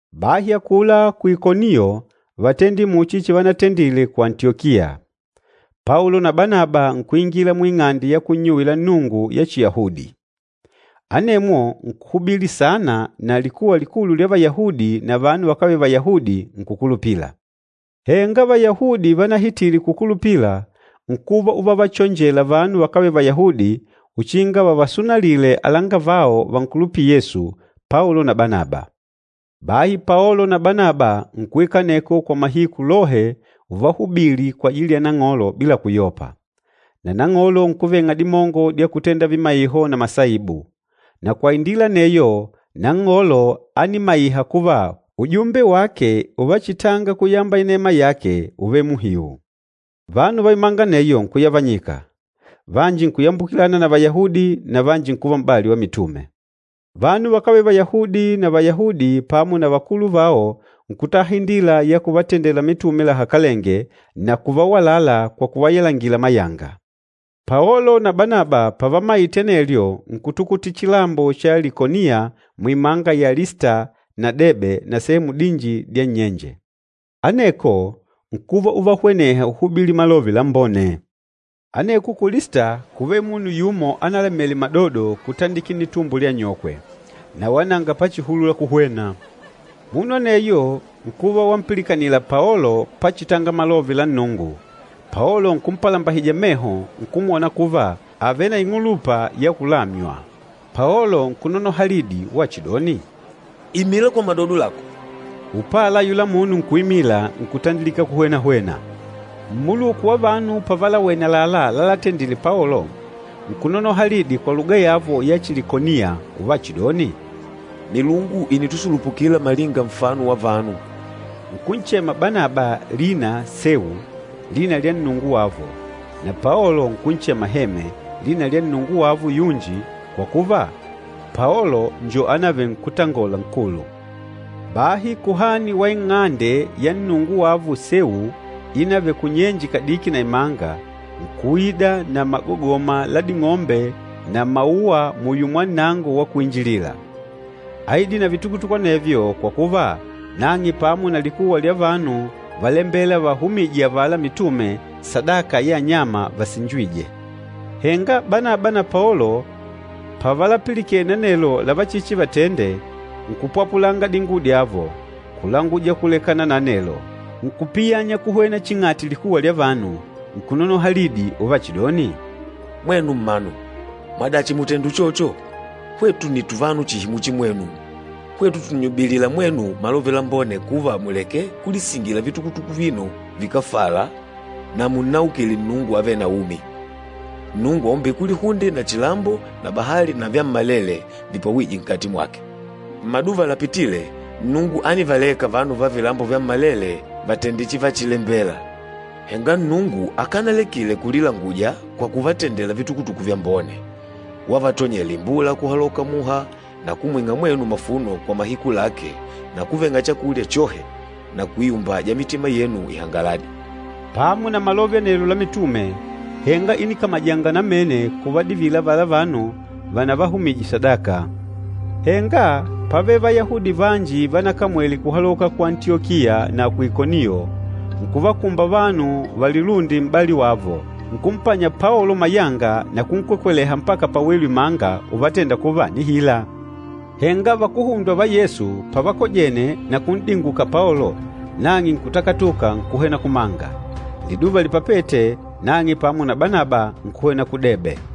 Bahi akula ku Ikoniyo vátendile muchi chivanatendile ku Antiyokiya. Paolo na Banaba nkuingila muing'ande ya kunnyuwila Nnungu ya Chiyahudi. Anemwo nkuhubili saana na likuwa likulu lya Vayahudi na vanu vakávele Vayahudi nkukulupila. Henga Vayahudi vanahitile kukulupila nkuva uvavachonjela vanu vakávele Vayahudi uchinga vavasunalile alangavao vankulupîla Yesu, Paolo na Banaba. Bahi Paolo na Banaba nkuikala aneko kwa mahiku lohe uvahubili kwajili ya Nang'olo bila kuyopa. Na Nang'olo nkuveng'a dimongo dya kutenda vimaiho na masaibu. Na kwa indila aneyo Nang'olo ánimaiha kuva ujumbe wake uvachitanga kuyamba inema yake úvele muhiu. Vanu va imanga aneyo nkuyavanyika, vanji nkuyambukilana na Vayahudi, na vanji nkuva m'bali wa mitume. Vanu vakávele Vayahudi na Vayahudi pamo na vakulu vao nkutaha indila ya kuvatendela mitume lahakalenge na kuvawalala kwa kuvayalangila mayanga. Paolo na Banaba pavamaite anelyo nkutukutila chilambo cha Likoniya muimanga ya Lista na Debe na sehemu dinji dya nnyenje. Aneko nkuva uvahweneha uhubili Malove Lambone. Aneko ku Lista kúvele munu yumo analamele madodo kutandikila nnitumbo lya anyokwe. Na wala nanga pachihulula kuhwena. Munu aneyo nkuva wampilikanila Paolo pachitanga Malove la Nnungu, Paolo nkumpalambahija meho nkumwona kuva àvele na ing'ulupa ya kulamya. Paolo nkunonoha lidi wachidoni, “Imila kwa madodo lako!” Upala ayula munu nkuimila nkutandilika kuhwena-hwena. Mmuluku wa vanu pavalawene àlalá lalatendile Paolo, nkunonoha lidi kwa luga yavo ya Chilikoniya uvachidoni, “Milungu ìnitusulupukila malinga nfano wa vanu!” Nkunchema Banaba Sewu, lina lya nnungu wavo, na Paolo nkunchema Heme, lina lya nnungu wavo yunji kwa kuva, Paolo njo anavele nkútangola nkulu. Bahi kuhani wa ing'ande ya nnungu wavo Sewu inavele kunyenje kadiki na imanga, nkuida na magogoma la ding'ombe na mauwa muyo mwa nnango wa kuinjilila. Áidile na vitukutuku anevyo kwa kuva nang'e pamo na likuwa lya vanu válembela vavahumije avala mitume sadaka ya anyama vasinjîjwe. Henga Banaba na Paolo pavalapilikene anelo lavachichivatende nkupwapulanga dinguwo dyavo, kulanguja kulekana na anelo. Nkupiyanya kuhwena ching'ati likuwa lya vanu, nkunonoha lidi uvachidoni, “Mwenu mmanu, mwadachi mùtenda uchocho? Hwetu nni tuvanu chihi muchi mwenu, hwetu tùnnyubilila mwenu malove lambone kuva muleke kulisingila vitukutuku avino vikáfala na munnaukile Nnungu avêle na umi, Nnungu aumbîle kulihunde na chilambo na bahali na vyammalele vipwawîje nkati mwake. Mmaduva lapitîle Nnungu ánivaleka vanu va vilambo vyammalele vatende chivachilembela. Henga Nnungu akanalekile kulilanguja kwa kuvatendela vitukutuku vyambone, wavatonyela imbula kuhaloka muha na kumwing'a mwenu mavuno kwa mahiku lake na kuveng'a chakulya chohe na kuiumbaja mitima yenu ihangaladi.” Pamo na malove anelo la mitume, henga ínikamajanga namene kuvadivila avala vanu vanavahumije sadaka. Henga pávele Vayahudi vanji vanakamwele kuhaloka ku Antiyokiya na ku Ikoniyo, nkuvakumba vanu valilunde m'bali wavo, nkumpanya Paolo mayanga na kunkwekweleha mpaka pawelu imanga uvatenda kuva ànihila. Henga vakuhundwa va Yesu pavakojene na kun'dinguka Paolo, nang'e nkutakatuka nkuhwena kumanga. Liduva lipapête, nang'e pamo na Banaba nkuhwena ku Debe.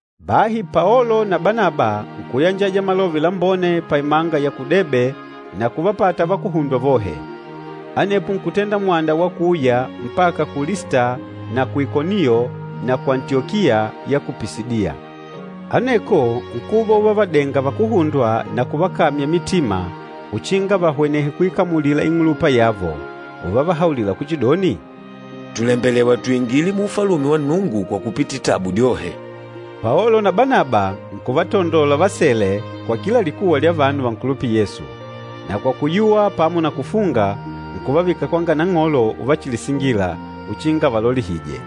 Bahi Paolo na Banaba nkuyanjaja Malove Lambone paimanga ya ku Debe na kuvapata vakuhundwa vohe. Anepo nkutenda mwanda wa kuuya mpaka ku Lista na ku Ikoniyo na ku Antiyokiya ya ku Pisidiya. Aneko nkuva uvavadenga vakuhundwa na kuvakamya mitima uchinga vahwenehe kuikamulila ing'ulupa yavo. Uvavahaulila kuchidoni, “Tùlembelewa tuingile mu Ufalume wa Nnungu kwa kupitila tabu dyohe.” Paolo na Banaba nkuvatandola vasele kwa kila likuwa lya vanu vankulupîla Yesu, na kwa kuyuwa pamo na kufunga, nkuvavika kwanga Nang'olo uvachilisingila, uchinga avalolihije.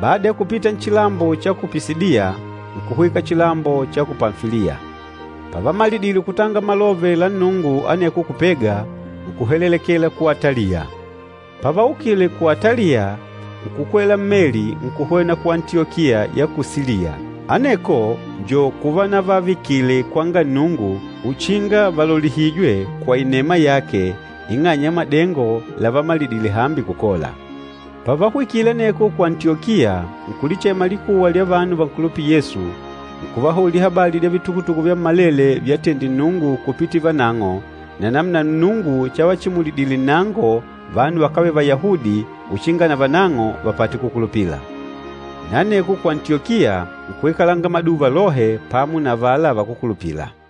Bada ya kupita nchilambo cha ku Pisidiya, nkuhwika chilambo cha ku Pamfiliya. Pavamalidile kutanga Malove la Nnungu aneko ku Pega, nkuhelelekela ku Ataliya. Pavaukile ku Ataliya nkukwela mmeli nkuhwena ku Antiyokiya ya ku Siliya, aneko njo kuvanavavikile kwanga Nnungu uchinga valolihijwe kwa inema yake ing'anya ya madengo lavamalidile hambi kukola. Pavahwikile aneko ku Antiyokiya, nkulichema likuwa lya vanu vankulupîla Yesu, nkuvahaulila habali dya vitukutuku vyammalele vyatendile Nnungu kupitila vanang'o na namuna Nnungu chavachimulidile nnango vanu vakávele Vayahudi uchinga navanang'o vapate kukulupila. Na aneko ku Antiyokiya nkuikalanga maduva lohe pamo na avala vakúkulupila.